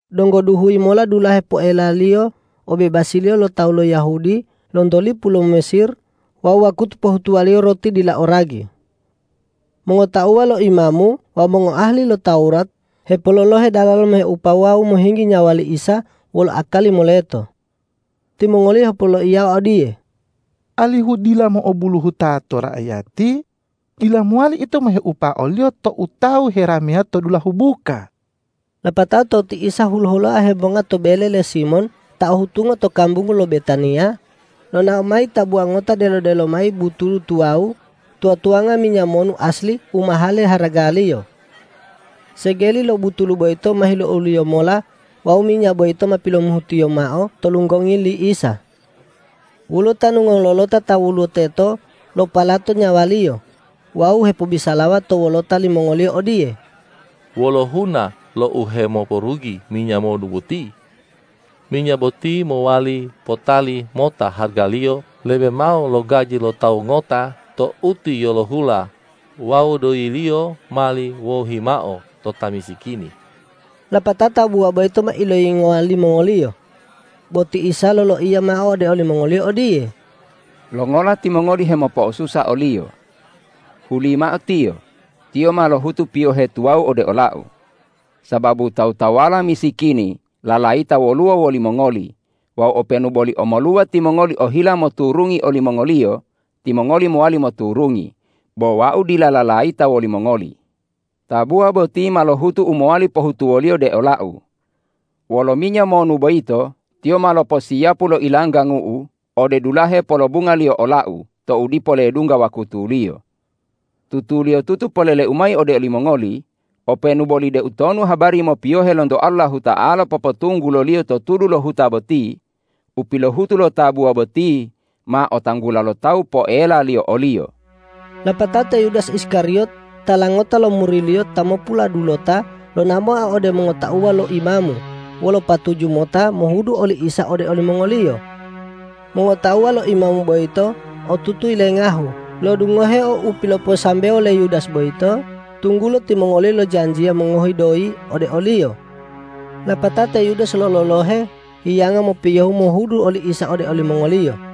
Donggo duhuyi mola dulahe poelaliyo obebasiliyo lo tawu lo Yahudi lonto lipu lo Mesir wawu wakutu pohutuwaliyo roti dila o ragi. Mongotauwa lo imamu wawu mongoahali lo Tawurat hepololohe dalalo moheupo wawu mohinggi nyawa li Isa wolo akali moleto. Timongoliyo hepoloiyawa odiye,”Alihu dila mo'obuluhuta to raiyati, dila mowali ito moheupa o-Liyo tou tawu herameya to dulahu buka.” Lapatao tou ti Isa hulo-huloa hemonga to bele le Simon ta o hutungo to kambungu lo Betaniya, lonao mayi tabuwa ngota delo-delo mayi butulu tuwawu tuwa-tuwanga minya monu asli u mahale haragaliyo. Segeli lo butulu boyito ma hiluoliyo mola wawu minya boyito ma pilomuhutiyo mao to lunggongi li Isa. Woluwo tanu ngololota ta woluwo teto lopalato nyawaliyo wawu hepobisalawa to wolota limongoliyo odiye,”Wolo huna lo uhemoporugi minya monu boti? Minya boti mowali potali mota haragaliyo lebe mao lo gaji lo tawu ngota to utiyolohula wawu doyiliyo mali wohimao to ta misikini.” Lapatao tabuwa boyito ma iloyingowa limongoliyo. Bo ti Isa loloiya mao ode olimongoliyo odiye,”Longola timongoli hemopo'osusa oliyo? Hulimao tiyo, tiyo ma lohutu piyohe tuwawu ode ola-U. Sababu tawu-tawuwala misikini lalayita woluwo wolimongoli wawu openu boli omoluwa timongoli ohila moturungi olimongoliyo, timongoli mowali moturungi, bo Wau dila lalayita wolimongoli. Tabuwa boti ma lohutu u mowali pohutuwoliyo de ola-U. Wolo minya monu boyito tiyo ma loposiyapu lo ilanggangu-U ode dulahe polobungaliyo ola-U tou dipo ledungga wakutuliyo. Tutuliyotutu polele-U mayi ode olimongoli: Openu boli deutonu habari mopiyohe lonto Allahuta'ala popotungguloliyo to tudu lo huta boti, u pilohutu lo tabuwa boti ma otanggula lo tawu poelaliyo oliyo.” Lapatao te Yudas Iskariyot tala ngota lo muri-Liyo ta mopuladulota lonao mao ode mongotauwa lo imamu wolo patuju mota mohudu oli Isa ode olimongoliyo. Mongotauwa lo imamu boyito otutu yilengahu lo'odungoheo u piloposambewo le Yudas boyito, tunggulo timongoliyo lojanjiya mongohi doyi ode oliyo. Lapatao te Yudas lololohe hiyanga mopiyohu mohudu oli Isa ode olimongoliyo.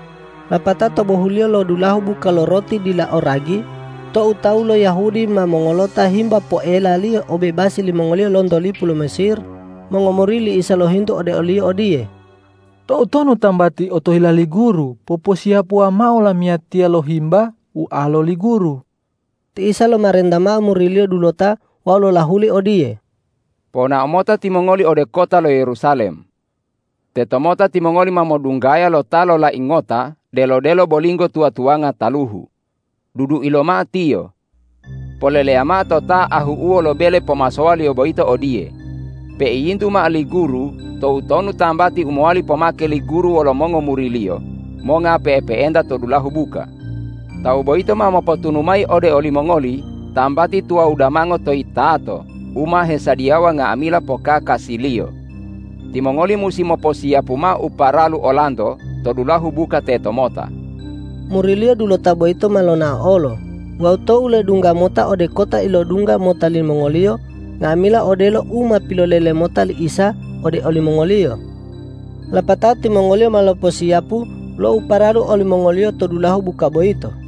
Lapatao to bohuliyo lo dulahu buka lo roti dila o ragi tou tawu lo Yahudi ma mongolota himba poelaliyo obebasi limongoliyo lonto lipu lo Mesir, mongomuri li Isa lohintu ode o-Liyo odiye,”Toutonu tambati otohila li Guru poposiyapuwa mao lamiyatiya lo himba ualo li Guru?” Ti Isa lomarenta mao muri-Liyo dulota wawu lolahuli odiye,”Ponao mota timongoli ode kota lo Yerusalem. Tetomota timongoli ma modunggaya lo ta lolai ngota delo-delo bolinggo tuwa-tuwanga taluhu. Dudui lomao tiyo. Poleleya mao to ta ahu'uwo lo bele pomasowaliyo boyito odiye, ’Peiyintu mao li Guru, toutonu tambati u mowali pomake li Guru wolo mongomuri-Liyo monga pe'epe'enta to dulahu buka?’ Tawu boyito ma mopotunu mayi ode olimongoli tambati tuwawu damango to yitato u ma hesadiyawa nga'amila pokakasiliyo. Timongoli musi moposiyapu mao u paralu olanto to dulahu buka tetomota!” Muri-Liyo dulota boyito ma lonao olo wawu tou ledungga mota ode kota ilodungga mota limongoliyo nga'amila odelo u ma pilolele mota li Isa ode olimongoliyo. Lapatao timongoliyo ma loposiyapu lo u paralu olimongoliyo to dulahu buka boyito.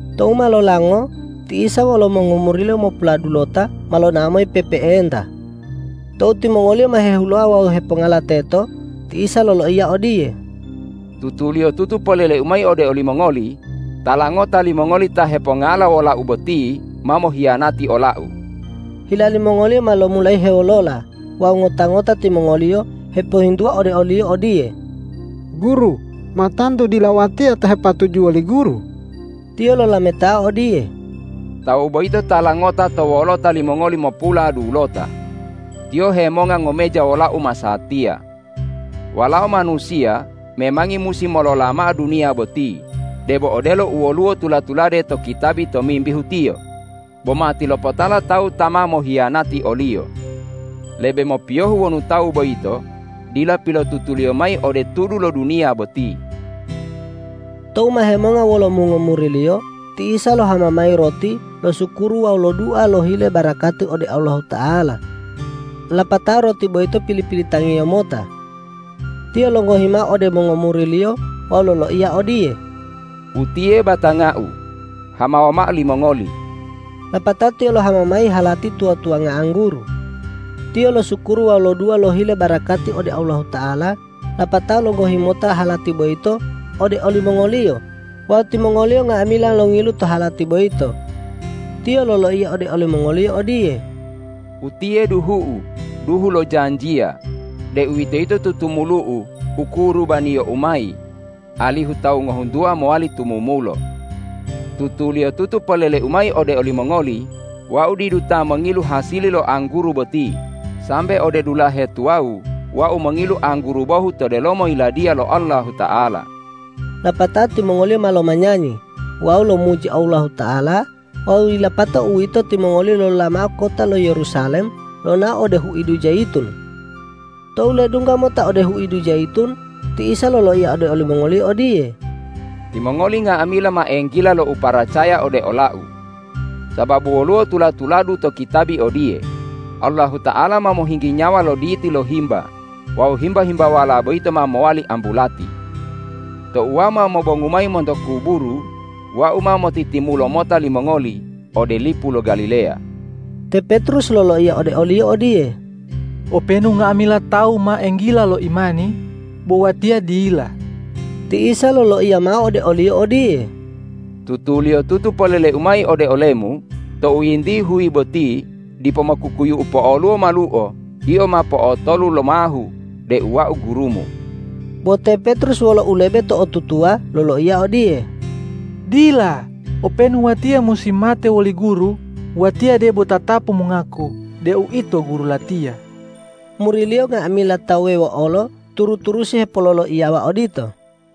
Tou ma lolango ti Isa wolo mongomuri-Liyo mopuladulota ma lonao mayi pe'epe'enta. Tou timongoliyo ma hehuloa wawu hepongala teto, ti Isa loloiya odiye,”Tutuliyotutu polele-U mayi ode olimongoli: Tala ngota limongoli ta hepongala wola-U boti ma mohiyanati ola-U.” Hila limongoliyo ma lomulayi hewolola wawu ngota-ngota timongoliyo hepohintuwa ode o-Liyo odiye,”Guru, ma tantu dila watiya ta hepatujuwo li Guru?” Tiyo lolametao odiye,”Tawu boyito tala ngota to wolota limongoli mopuladulota. Tiyo hemonga ngomeja wola-U masatiya. Walao Manusiya memangi musi molola mao duniya boti debo odelo u woluwo tula-tulade to kitabi tomimbihu Tiyo, bo matilopotala tawu ta ma mohiyanati o-Liyo. Lebe mopiyohu wonu tawu boyito dila pilotutuliyo mayi ode tudu lo duniya boti.” Tou ma hemonga wolo mongomuri-Liyo, ti Isa lohama mayi roti losukuru wawu lodua lohile barakati ode Allahuta'ala. Lapatao roti boyito pili-pilitang-Iyo mota. Tiyo longohi mao ode mongomuri-Liyo wawu loloiya odiye,”Utiye batanga-U, hamawa mao limongoli.” Lapatao Tiyo lohama mayi halati tuwa-tuwanga angguru. Tiyo losukuru wawu lodua lohile barakati ode Allahuta'ala lapatao longohi mota halati boyito ode olimongoliyo wawu timongoliyo nga'amila longilu to halati boyito. Tiyo loloiya ode olimongoliyo odiye,”Utiye duhu-U, duhu lo janjiya, deuwitoyito tutumulu-U u kurubaniyo-U mayi, alihu tawu ngohuntuwa mowali tumumulo. Tutuliyotutu polele-U mayi ode olimongoli: Wau didu ta mongilu hasili lo angguru boti, sambe ode dulahe tuwawu Wau mongilu angguru bohu to delomo Yiladiya lo Allahuta'ala.” Lapatao timongoliyo ma lomanyanyi wawu lomuji Allahuta'ala wawu yilapato uwito timongoliyo lolola mao kota lo Yerusalem lonao ode huidu Jayitun. Tou ledungga mota ode huidu Jayitun, ti Isa loloiya ode olimongoliyo odiye,”Timongoli nga'amila ma enggila lo uparacaya ode ola-U. Sababu woluwo tula-tuladu to kitabi odiye, ’Allahuta'ala ma mohinggi nyawa lo diti lo himba wawu himba- himbawala boyito ma mowali ambulati.’ Tou Wau ma mobongu mayi monto kuburu, Wau ma motitimulo mota limongoli ode lipu lo Galileya.” Te Petrus loloiya ode o-Liyo odiye,”Openu nga'amila tawu ma enggila lo imani, bo watiya dila.” Ti Isa loloiya mao ode oliyo odiye,”Tutuliyotutu polele-U mayi ode olemu: Tou yinti huyi boti dipo mokukuyu'u po'oluwo maluo, yio ma po'otolu lomahu deu Wau gurumu.” Bo te Petrus wolo ulebe to'otutuwa loloiya odiye,”Dila, openu watiya musi mate woli Guru, watiya debo tatapu mongaku deu Ito Guru latiya.” Muri-Liyo nga'amila ta wuwewo olo turu-turusi hepololoiyawa odito.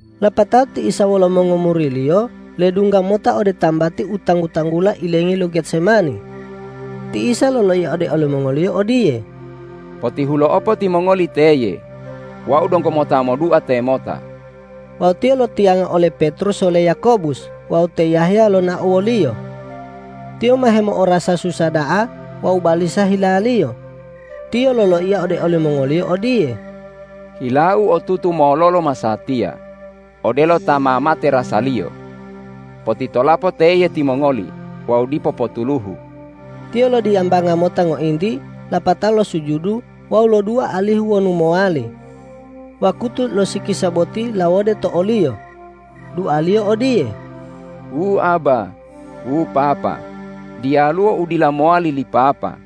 Lapatao ti Isa wolo mongomuri-Liyo ledungga mota ode tambati u tanggu-tanggula ilengi lo Getsemani. Ti Isa loloiya ode olimongoliyo odiye,”Potihulo'opo timongoli teye. Wau donggo mota modua temota.” Wawu Tiyo lotiyanga ole Petrus wole Yakobus wawu te Yahya lonao wo-Liyo. Tiyo ma hemo'orasa susa da'a wawu balisa hilaliyo. Tiyo loloiya ode olimongoliyo odiye,”Hila-U otutu mololo masatiya, odelo ta ma mate rasaliyo. Potitolapo teye timongoli wawu dipo potuluhu.” Tiyo lodiyambanga mota ngointi lapatao losujudu wawu lodua alihu wonu mowali, wakutu lo sikisa boti lawode to o-Liyo. Dua-Liyo odiye,”Wu Abba, wu Papa, diyaluwo u dila mowali li Papa.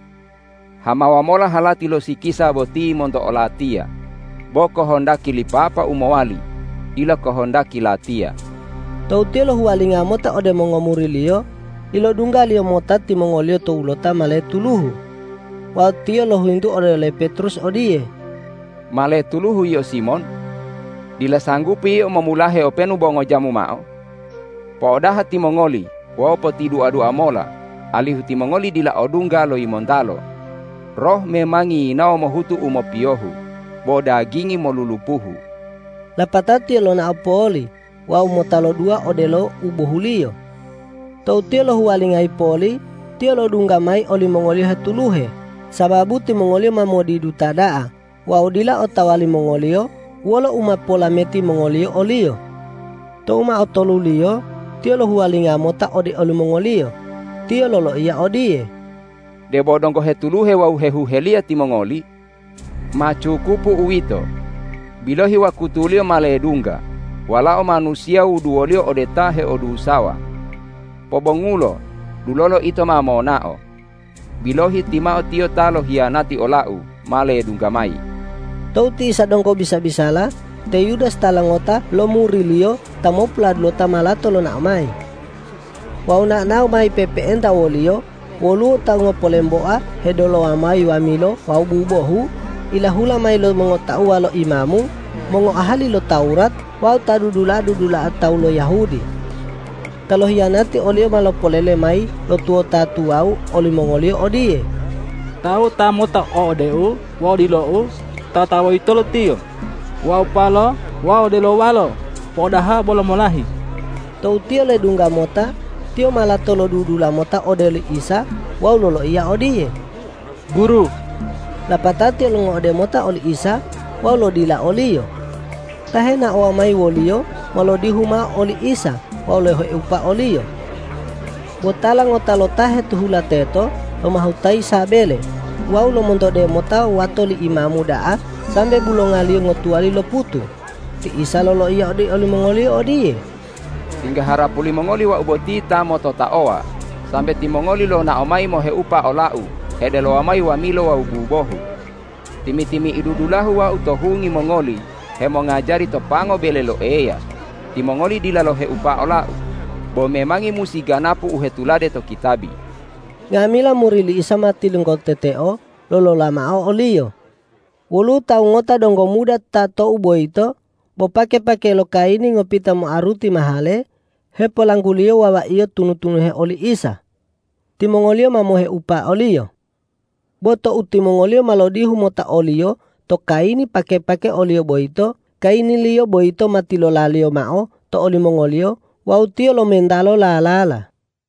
Hamawa mola halati lo sikisa boti monto o-Latiya; bo kohondaki li Papa u mowali, dila kohondaki Latiya.” Tou Tiyo lohuwalinga mota ode mongomuri-Liyo, ilodungga-Liyo mota timongoliyo towulota ma letuluhu. Wawu Tiyo lohintu ode le Petrus odiye,”Ma letuluhu yio Simon? Dila sanggupi yio momulahe openu bo ngojamu mao! Po'odaha timongoli wawu potidua-dua mola alihu timongoli dila odungga lo yimontalo. Roh memangi yinawo mohutu u mopiyohu, bo dagingi molulupuhu.” Lapatao Tiyo lonao poli wawu mota lodua odelo u bohuliyo. Tou Tiyo lohuwalingayi poli, Tiyo lo'odungga mayi olimongoliyo hetuluhe, sababu timongoliyo ma modiduta da'a wawu dila otawa limongoliyo wolo u ma polameti mongoliyo o-Liyo. Tou ma otoluliyo Tiyo lohuwalinga mota ode olimongoliyo, Tiyo loloiya odiye,”Debo donggo hetuluhe wawu hehuheliya timongoli? Ma cukupu uwito! Bilohi wakutuliyo ma ledungga Walao Manusiya wuduwoliyo ode ta heodusawa. Pobongulo, dulolo ito ma monao. Bilohi, timao tiyo ta lohiyanati ola-U ma ledungga mayi.” Tou ti Isa donggo bisa-bisala, te Yudas tala ngota lo muri-Liyo ta mopuladulota ma lato lonao mayi. Wawu nao-nao mayi pe'epe'enta woliyo woluwo tawu ngopolemboa hedelowa mayi wamilo wawu bubohu, ilahula mayi lo mongotauwa lo imamu, mongoahali lo Tawurat wawu ta dudula'a-dudula'a tawu lo Yahudi. Ta lohiyanati o-Liyo ma lopolele mayi lo tuwota tuwawu olimongoliyo odiye,”Tawu ta mota o'odeu wawu dilou, tataboyitolo Tiyo, waupalo wawu delowalo po'odaha bolo molahi.” Tou tiyo ledungga mota, tiyo ma lato lodudula mota ode oli Isa wawu loloiya odiye,”Guru!” Lapatao tiyo longo'ode mota oli Isa wawu lodila o-Liyo. Ta henaowa mayi woliyo ma lodihu mao oli Isa wawu loheupa o-Liyo. Bo tala ngota lo ta hetihula teto lomahutayi sabele wawu lomontode mota wato li imamu da'a sambe bulongaliyo ngotuwali loputu. Ti Isa loloiya ode limongoliyo odiye,”Tingga harapu limongoli Wau boti ta mototaowa, sambe timongoli lonao mayi moheupa ola-U hedelowa mayi wamilo wawu bubohu. Timi-timi'idu dulahu Wau to hungi mongoli hemongajari to pango bele lo Eya, timongoli dila loheupa ola-U. Bo memangi musi ganapu u hetulade to kitabi.” Nga'amila muri li Isa ma tilonggoteteo lolola mao o-Liyo. Woluwo tawu ngota donggo muda ta tou boyito bo pake-pake lo kayini ngopita moaruti mahale hepolangguliyo wawaiyo tunu-tunuhe oli Isa. Timongoliyo ma moheupa oliyo. Bo tou timongoliyo ma lodihu mota oliyo to kayini pake-pake oliyo boyito, kayiniliyo boyito ma tilolaliyo mao to olimongoliyo wawu tiyo lomentalo lalala.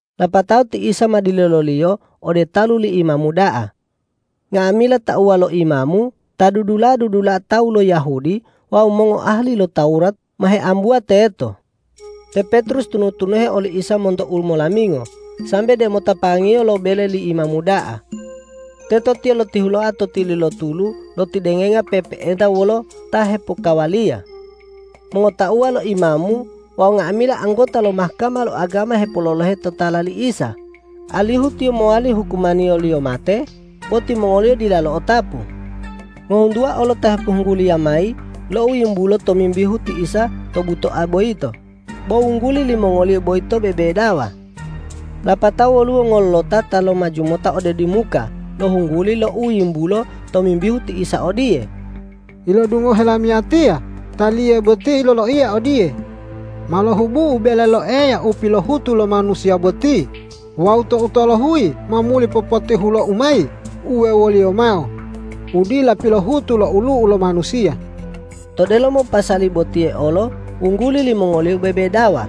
Lapatao ti Isa ma dileloliyo ode talu li imamu da'a. Nga'amila tauwa lo imamu, ta dudula'a-dudula'a tawu lo Yahudi wawu mongoahali lo Tawurat ma heambuwa teto. Te Petrus tunu-tunuhe oli Isa monto umolamingo, sambe demota pangiyo lo bele li imamu da'a. Teto tiyo lotihuloa to tili lo tulu lotidengenga pe'epe'enta wolo ta hepokkawaliya. Mongotauwa lo imamu wawu nga'amila anggota lo Mahkama lo agama hepololohe totala li Isa, alihu Tiyo mowali hukumaniyoliyo mate, bo timongoliyo dila lo'otapu. Ngohuntuwa olo ta hepohungguliya mayi lo u yimbulo tomimbihu ti Isa to butoa boyito, bo wungguli limongoliyo boyito bebedawa. Lapatao woluwo ngololota ta lomaju mota ode dimuka lohungguli lo u yimbulo tomimbihu ti Isa odiye, ”Ilodungohe lamiyatiya Taliye boti loloiya odiye, ’Ma lohubu-U bele lo Eya u pilohutu lo manusiya boti wawu tou tolohuyi ma muli popotihulo-U mayi uwewoliyo mao, u dila pilohutu lo olu'u lo manusiya.’” To delomo pasali botiye olo wungguli limongoliyo bebedawa.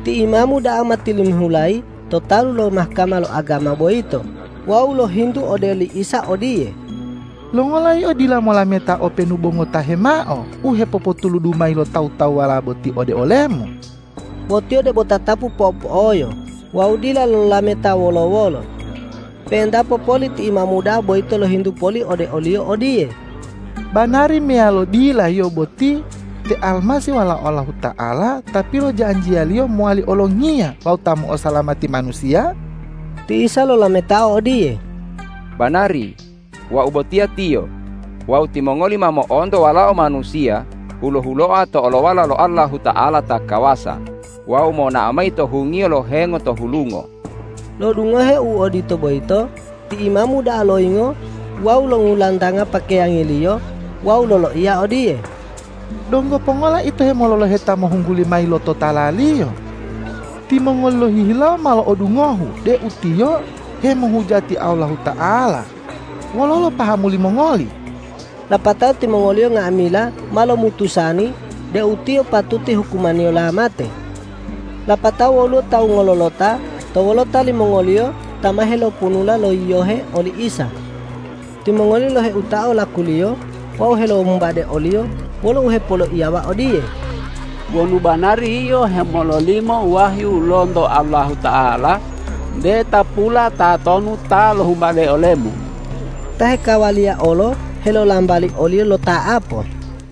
Ti imamu da'a ma tilimihulayi to talu lo Mahkama lo agama boyito wawu lohintu ode li Isa odiye,”Longola Yio dila molameta openu bo ngotahe mao u hepopotuludu mayi lo tawu-tawuwala boti ode ole-Mu?” Bo Tiyo debo tatapu po'opo'oyo wawu dila lolameta wolo-wolo. Pe'entapo poli ti imamu da'a boyito lohintu poli ode o-Liyo odiye,”Banari meyalo dila Yio boti te Almasih Walao Allahuta'ala ta pilojanjiya-Liyo mowali olongiya wawu ta mo'osalamati manusiya?” Ti Isa lolametao odiye,”Banari, Wau botiya Tiyo wawu timongoli ma mo'onto Walao Manusiya hulo-huloa to olowala lo Allahuta'ala ta kawasa wawu monao mayi to hungiyo lo hengo to hulungo.” Lo'odungoheo u odito boyito, ti imamu da'a loyingo wawu longulantanga pakeyangiliyo wawu loloiya odiye,”Donggo pongola ito hemololohe ta mohungguli mayi lo totala-Liyo? Timongoli lohihilawo ma lo'odungohu deu Tiyo hemohujati Allahuta'ala. Wololo pahamu limongoli?” Lapatao timongoliyo nga'amila ma lomutusani deu Tiyo patuti hukumaniyola mate. Lapatao woluwo tawu ngololota to wolota limongoliyo ta ma heloponula lo yiyohe oli Isa. Timongoliyo loheutao lakuliyo wawu helohumbade o-Liyo wolo uhepoloiyawa odiye,”Wonu banari Yio hemololimo wahyu lonto Allahuta'ala, nte tapula tatonu ta lohumbade ole-Mu.” Ta hekawaliya olo helolambali o-Liyo lota'apo.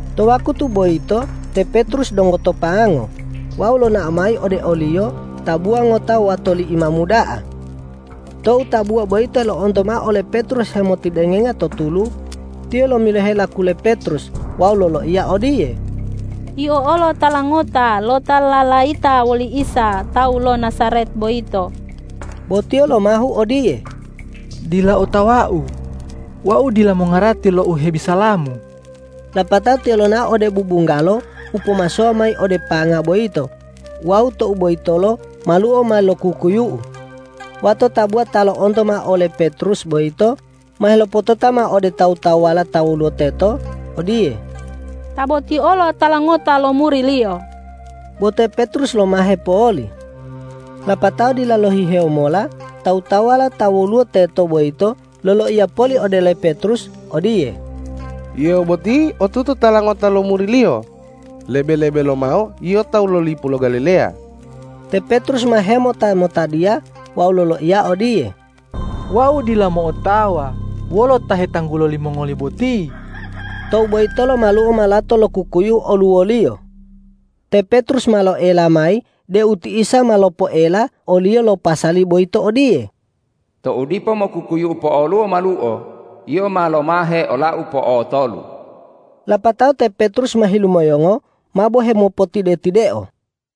To wakutu boyito te Petrus donggo to pango wawu lonao mayi ode oliyo tabuwa ngota wato li imamu da'a. Tou tabuwa boyito lo'onto mao ole Petrus hemotidengenga to tulu, tiyo lomiloheo laku le Petrus wawu loloiya odiye,”Yio olo tala ngota lo ta lalayita woli Isa tawu lo Najaret boyito.” Bo tiyo lomahu odiye,”Dila otawau. Wau dila mongarati lo u hebisalamu.” Lapatao tiyo lonao ode bubunggalo u pomasowa mayi ode panga boyito wawu tou boyitolo maluo ma lokukuyu'u. Wato tabuwa ta lo'onto mao ole Petrus boyito ma helopotota mao ode tawu-tawuwala ta woluwo teto odiye,”Ta boti olo tala ngota lo muri-Liyo.” Bo te Petrus lomahe poli. Lapatao dila lohihewo mola tawu-tawuwala ta woluwo teto boyito loloiya poli ode le Petrus odiye,”Yio boti otutu tala ngota lo muri-Liyo, lebe-lebe lomao yio tawu lo lipu lo Galileya.” Te Petrus ma hemota-motadiya wawu loloiya odiye,”Wau dila mo'otawa wolo ta hetanggulo limongoli boti!” Tou boyitolo maluo ma lato lokukuyu'u oluwoliyo. Te Petrus ma lo'oela mayi deu ti Isa ma lopoela oliyo lo pasali boyito odiye,”Tou dipo mokukuyu'u po'oluwo maluo, yio ma lomahe ula-U po'otolu.” Lapatao te Petrus ma hilumoyongo mabo hemopotide-tideo.